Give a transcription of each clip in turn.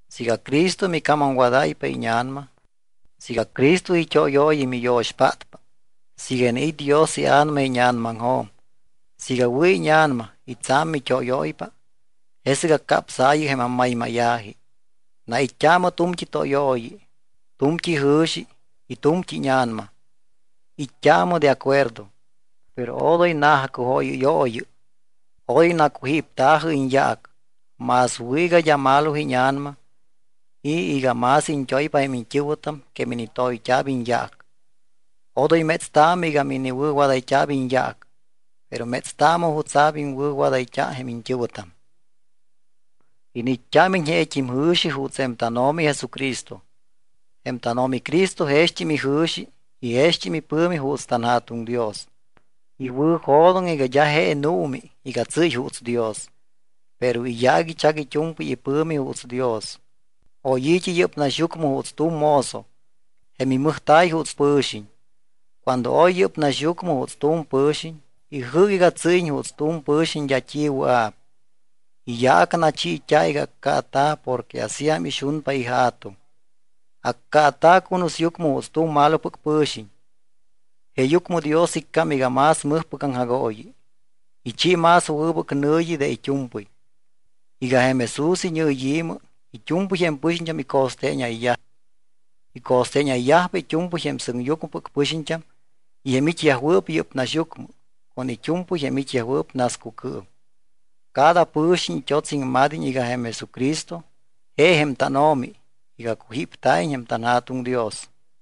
Siiga Cristo micamamwadáypa íña̱nama, siiga Cristo it́óyooyi miyo̱xpátpa, siiga iniit́ Dios iA̱nama íña̱namaŋjo̱m, siiga wɨ̱ íña̱nama y tsa̱m mit́óyóypa, jesɨc acapsaayɨ jém ammaymáya̱ji. Nait́t́aamɨ tu̱mt́i tóyooyi, tu̱mt́i jɨ̱xi y tu̱mt́i íña̱nama. It́t́aamɨ de acuerdo. Pero odoy na̱jacujóyɨ́yooyɨ, odoy nacujípta̱jɨ iñyaac. Más wɨ̱ iga d́a malo íña̱nama y iga más iñt́oypa jém iñt́ɨ̱wɨtam que minitoyt́a̱p iñyaac. Odoy métstaamɨ iga miniwɨ̱wadayt́a̱p iñyaac. Pero métstaamɨ jutsa̱p iŋwɨ̱wadáyt́a jém iñt́ɨ̱wɨtam. Iniit́t́ámiñ jeet́im jɨ̱xi juuts jém tánO̱mi Jesucristo. Jém tánO̱mi Cristo jext́im ijɨ̱xi y jext́im ipɨ̱mi juuts tanJa̱tuŋ Dios. Iwɨ̱jo̱doŋ iga d́a je nuumi iga tsɨ́y juuts Dios. Pero iyaac ichac it́u̱mpɨy ipɨ̱mi juuts Dios. Oy i̱t́i yɨ́p naxyucmɨ juuts tu̱m mozo. Jém imɨjta̱y juuts pɨ̱xiñ. Cuando oy yɨ́p naxyucmɨ juuts tu̱m pɨ̱xiñ, ijɨ́c iga tsɨ́yiñ juuts tu̱m pɨ̱xiñ d́a t́i wɨa̱p. Iyaac nachiit́a̱ iga accaata̱ porque asíam ixunpa iJa̱tuŋ. Accaata̱ cunusyucmɨ juuts tu̱m malopɨc pɨ̱xiñ. Jeeyucmɨ Dios iccám iga más mɨjpɨc aŋjagooyi. Ichi más wɨbɨc nɨ̱yi de it́u̱mpɨy, iga jém Jesús iñɨyi̱mɨ it́u̱mpɨy jém pɨxiñt́am ico̱steeñayyaj. Ico̱steeñayyajpa it́u̱mpɨy jém sɨŋyucmɨpɨc pɨxiñt́am y jém it́yajwɨɨp yɨ́p naxyucmɨ con it́u̱mpɨy jém it́yajwɨɨp nascucɨɨm. Cada pɨ̱xiñ it́ots iŋmad́iñ iga jém Jesucristo je jém tánO̱mi iga cujípta̱iñ jém tanJa̱tuŋ Dios.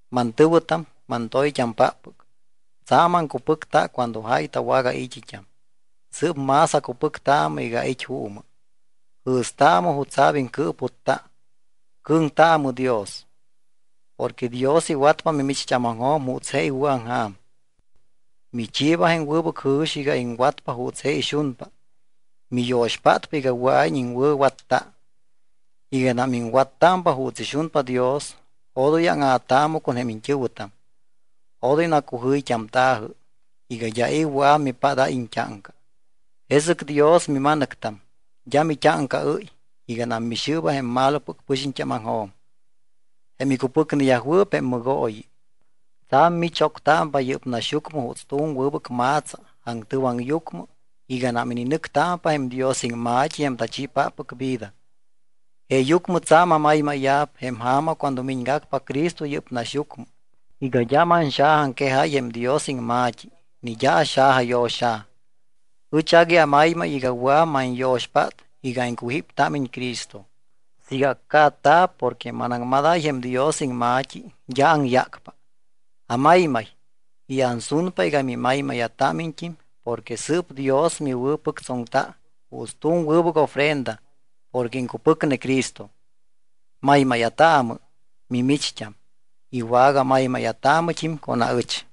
Mantɨ̱wɨtam, mantoyt́ampáppɨc, tsa̱m aŋcupɨcta cuando jáy tawagai̱t́it́am, sɨɨp más acupɨctaamɨ iga ait́ juumɨ. Jɨ̱staamɨ jutsa̱p iŋcɨɨputta. Cɨ̱ŋtaamɨ Dios. Porque Dios iwatpa mimicht́ámaŋjo̱m juuts je iwɨ̱aŋja̱m. Michiiba jém wɨbɨc jɨ̱xi iga iŋwatpa juuts je ixunpa, miyo̱xpátpa iga wɨa̱iñ iŋwɨ̱watta. Iganam iŋwattámpa juuts ixunpa Dios odoy áŋa̱taamɨ con jém iñt́ɨ̱wɨtam. Odoy nacujɨyt́amta̱jɨ, iga d́a i̱ wɨa̱p mipádáy iñt́áŋca. Jesɨc Dios mima̱nɨctam, d́a mit́áŋcaɨ́y iganam mixɨɨba jém malopɨc pɨxiñt́ámaŋjo̱m, jém icupɨcneyajwɨɨp jém mɨgooyi. Tsa̱m michoctámpa yɨ́p naxyucmɨ juuts tu̱m wɨbɨc ma̱tsa aŋtɨwaŋyucmɨ iganam ininɨctámpa jém Dios iŋma̱t́i jém tachiipáppɨc vida. Jeeyucmɨ tsa̱m amaymáya̱p jém ja̱ma cuando miñgacpa Cristo yɨ́p naxyucmɨ iga d́a manxajaaŋquejáy jém Dios iŋma̱t́i ni d́a axajayo̱xa̱. Ɨch agui amaymay iga wɨa̱p manyo̱xpát iga iŋcupɨctámiñ Cristo. Siiga accaata̱p porque manaŋmadáy jém Dios iŋma̱t́i, d́a aŋyácpa. Amaymay y ansunpa iga mimaymáya̱támiñt́im porque sɨɨp Dios miwɨ̱pɨctsoŋpa juuts tu̱m wɨbɨc ofrenda porque iŋcupɨcne Cristo. Maymáya̱taamɨ mimicht́am y wagamaymáya̱taamɨt́im con aɨch.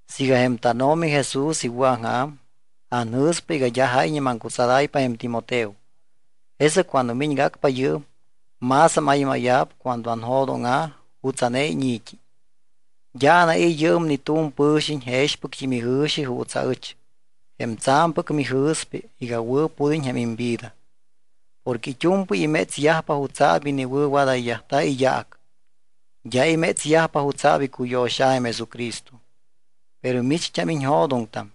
Siiga jém tánO̱mi Jesús iwɨ̱aŋja̱m, anjɨ̱spa iga d́a jáyñe maŋcutsadáypa jém Timoteo. Jesɨc cuando miñgacpa yɨɨm, más amaymáya̱p cuando anjo̱dóŋa̱ jutsa̱ne íñi̱t́i. D́a anai̱ yɨɨm ni tu̱m pɨ̱xiñ jexpɨct́im ijɨ̱xi juuts aɨch, jém tsa̱mpɨc mijɨ̱spa iga wɨ̱pud́iñ jém imvida. Porque it́u̱mpɨy imétsyajpa jutsa̱p iniwɨ̱wadayyajta̱ iyaac. D́a imétsyajpa jutsa̱p icuyo̱xa̱ jém Jesucristo. Pero micht́am iñjo̱doŋtam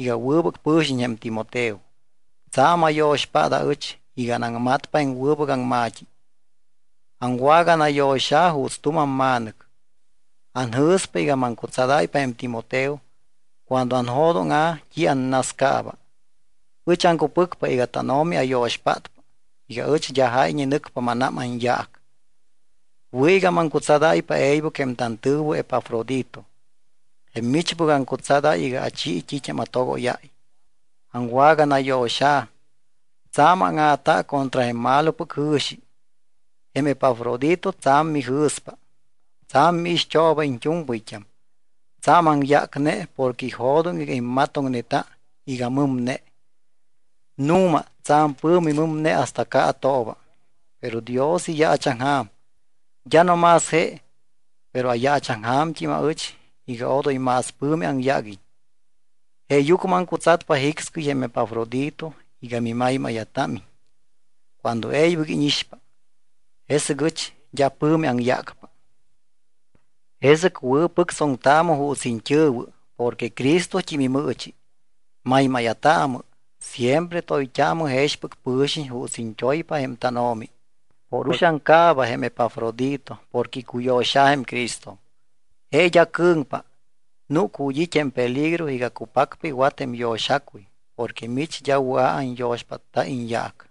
iga wɨbɨc pɨ̱xiñ jém Timoteo, tsa̱m ayo̱xpát aɨch iga anaŋmatta jém wɨbɨc aŋma̱t́i, aŋwaganayo̱xa̱ juuts tu̱m amma̱nɨc. Anjɨ̱spa iga maŋcutsadáypa jém Timoteo cuando anjo̱dóŋa̱ t́i annascaaba. Ɨch aŋcupɨcpa iga tánO̱mi ayo̱xpátpa iga ɨch d́a jáyñe nɨcpa mánám anyaac. Wɨ̱ iga maŋcutsadáypa e̱ybɨc jém tantɨ̱wɨ Epafrodito, jém michpɨc aŋcutsadáy iga achi t́it́am atogóyáy. Aŋwaganayo̱xa̱, tsa̱m áŋa̱ta contra jém malopɨc jɨ̱xi. Jém Epafrodito tsa̱m mijɨ̱spa. Tsa̱m miixt́ooba iñt́u̱mpɨyt́am. Tsa̱m aŋyácne porque ijo̱doŋ iga immatoŋneta iga mɨmne. Nu̱ma, tsa̱m pɨ̱mi mɨmne hasta caatooba. Pero Dios iyaachaŋja̱m. D́a no más je, pero ayaachaŋja̱mt́im aɨch iga odoy más pɨ̱mi aŋyáguiñ. Jeeyucmɨ aŋcutsatpa jicscɨy jém Epafrodito iga mimaymáya̱támiñ cuando e̱ybɨc íñixpa. Jesɨc ɨch d́a pɨ̱mi aŋyácpa. Jesɨc wɨ̱pɨctsoŋtaamɨ juuts iñt́ɨ̱wɨ porque Cristot́im imɨɨchi. Maymáya̱taamɨ, siempre toyt́aamɨ jexpɨc pɨ̱xiñ juuts iñt́oypa jém tánO̱mi. Por uxaŋ caaba jém Epafrodito porque icuyo̱xa̱ jém Cristo. Je d́a cɨ̱ŋpa, núc ju̱t́ it́ jém peligro iga cupacpa iwat jém yo̱xacuy porque mich d́a wɨa̱ anyo̱xpátta iñyaac.